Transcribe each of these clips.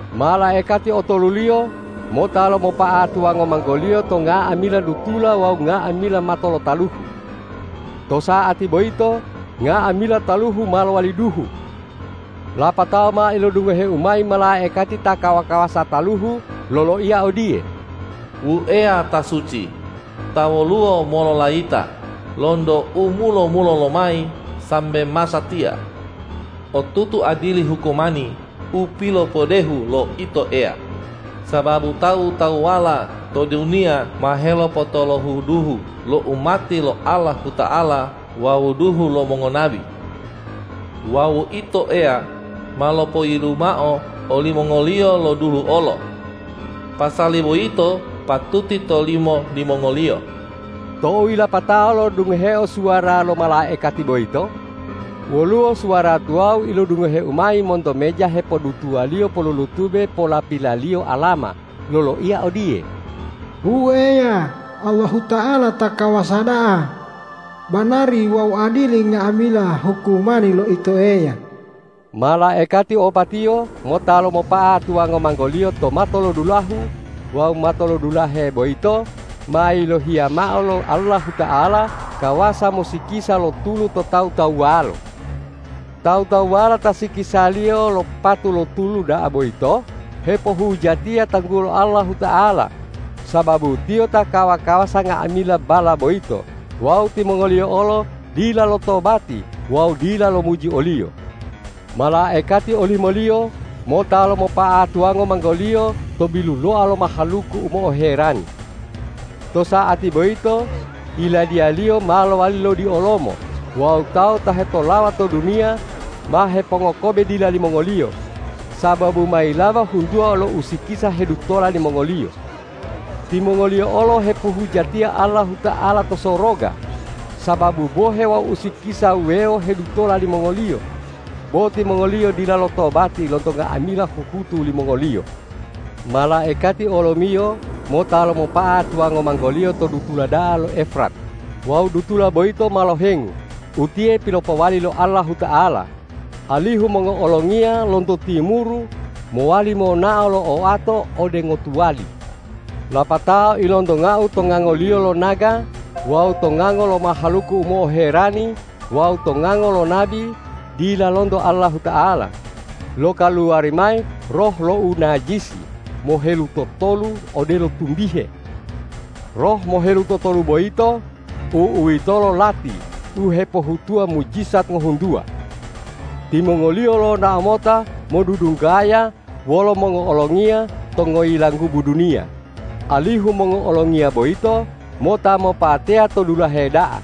Malaikati otoluliyo mota lomopa'a tuwango manggoliyo to nga'amila dutula wawu nga'amila mato lo taluhu. To sa'ati boyito nga'amila taluhu ma lowali duhu. Lapatao ma ilodungoheu mayi malaikati ta kawa-kawasa taluhu loloiya odiye,”Wu Eya ta suci, ta woluwo mololayita lonto u mulo-mulolo lomayi sambe masatiya! Otutu adili hukumani u pilopodehu lo Ito Eya, sababu tawu-tawuwala to duniya ma helopotolohu duhu lo umati lo Allahuta'ala wawu duhu lo mongonabi. Wawu Ito Eya ma lopoyilu mao olimongoliyo lo duhu olo. Pasali boyito patuti tolimo limongoliyo.” Tou yilapato lo'odungoheo suwara lo malaikati boyito, woluwo suwara tuwawu ilodungoheu mayi monto meja hepodutuwaliyo polulutube polapilaliyo alama, loloiya odiye,”Wu Eya, Allahuta'ala ta kawasa da'a! Banari wawu adili nga'amila hukumani lo Ito Eya.” Malaikati opatiyo mota lomopa'a tuwango manggoliyo to matolodulahu wawu matolodulahe boyito ma yilohiya mao lo Allahuta'ala kawasa mosikisa lo tulu to tawu-tawuwalo. Tawu-tawuwala ta silikisaliyo lo patu lo tulu da'a boyito hepohujatiya tanggulo Allahuta'ala, sababu Tiyo ta kawa-kawasa nga'amila balla boyito wawu timongoliyo olo dila lotobati wawu dila lomuji o-Liyo. Malaikati olimoliyo mota lomopa'a tuwango manggoliyo to biluloa lo mahaluku u mo'oherani. To sa'ati boyito yiladiyaliyo ma lowali lodiolomo wawu tawu ta hetolawa to duniya ma hepongokobe dila limongoliyo, sababu ma yilaba huntuwa lo usikisa hedutola limongoliyo. Timongoliyo olo hepohujatiya Allahuta'ala to soroga sababu bohe wawu usikisa wuwewo hedutola limongoliyo, bo timongoliyo dila lotobati lonto nga'amila huhutu limongoliyo. Malaikati olomiyo mota lomopa'a tuwango manggoliyo to dutula da'a lo Efrat wawu dutula boyito ma lohengu utiye pilopowali lo Allahuta'ala, alihu mongo'olongiya lonto timuru mowali monao lo oato ode ngotuwali. Lapatao ilontongau to ngangoliyo lo naga wawu to ngango lo mahaluku u mo'oherani wawu to ngango lo nabi dila lonto Allahuta'ala, lokaluwari mayi roh lo unajisi mohelutotolu odelo tumbihe. Roh mohelutotolu boyito, u'uwitolo lati u hepohutuwa mujijat ngohuntuwa. Timongoliyo lonao mota modudunggaya wolo mongo'olongiya to ngoyilanggubu duniya, alihu mongo'olongiya boyito mota mopateya to dulahe da'a,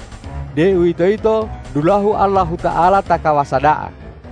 deuwitoyito dulahu Allahuta'ala ta kawasa da'a.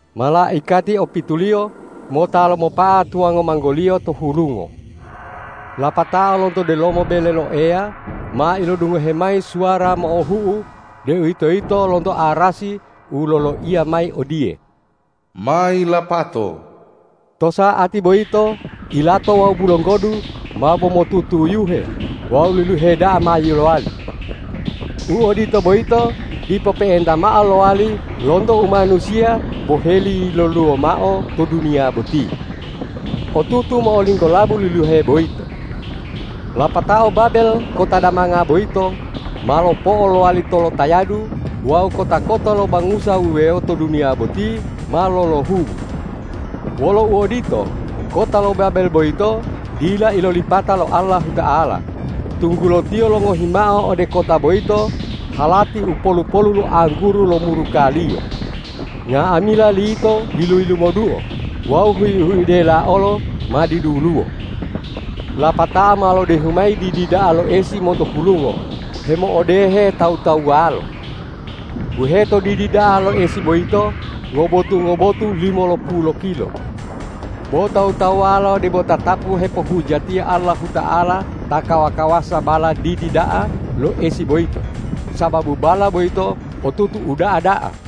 Malaikati opituliyo mota lomopa'a tuwango manggoliyo to hulungo. Lapatao lonto delomo bele lo Eya ma ilodungohe mayi suwara mo'ohu'u, deuwitoyito lonto arasi u loloiya mayi odiye,”Ma yilapato.” To sa'ati boyito ilato wawu bulonggodu mabo motutuyuhe wawu liluhe da'a ma yilowali. U odito boyito dipo pe'enta mao lowali lonto u manusiya boheli yiloluwo mao to duniya boti. Otutu mo'olinggolabu liluhe boyito. Lapatao Babel kota damanga boyito ma lopo'o lowali tolotayadu wawu kota-kota lo bangusa wuwewo to duniya boti ma lolohubu. Wolo uodito, kota lo Babel boyito dila ilolipata lo Allahuta'ala, tunggulo Tiyo longohi mao ode kota boyito halati u polu-polu lo angguru lo muruka-Liyo. Nga'amila lito yilu-yilumoduo wawu hui-huidela olo ma diduluwo. Lapatao ma lodehu mayi didi da'a lo esi monto hulungo hemo'odehe tawu-tawuwalo. Buheto didi da'a lo esi boyito ngobotu-ngobotu limolopulu lokilo. Bo tawu-tawuwalo debo tatapu hepohujatiya Allahuta'ala ta kawa-kawasa balla didi da'a lo esi boyito, sababu balla boyito otutu uda'a da'a.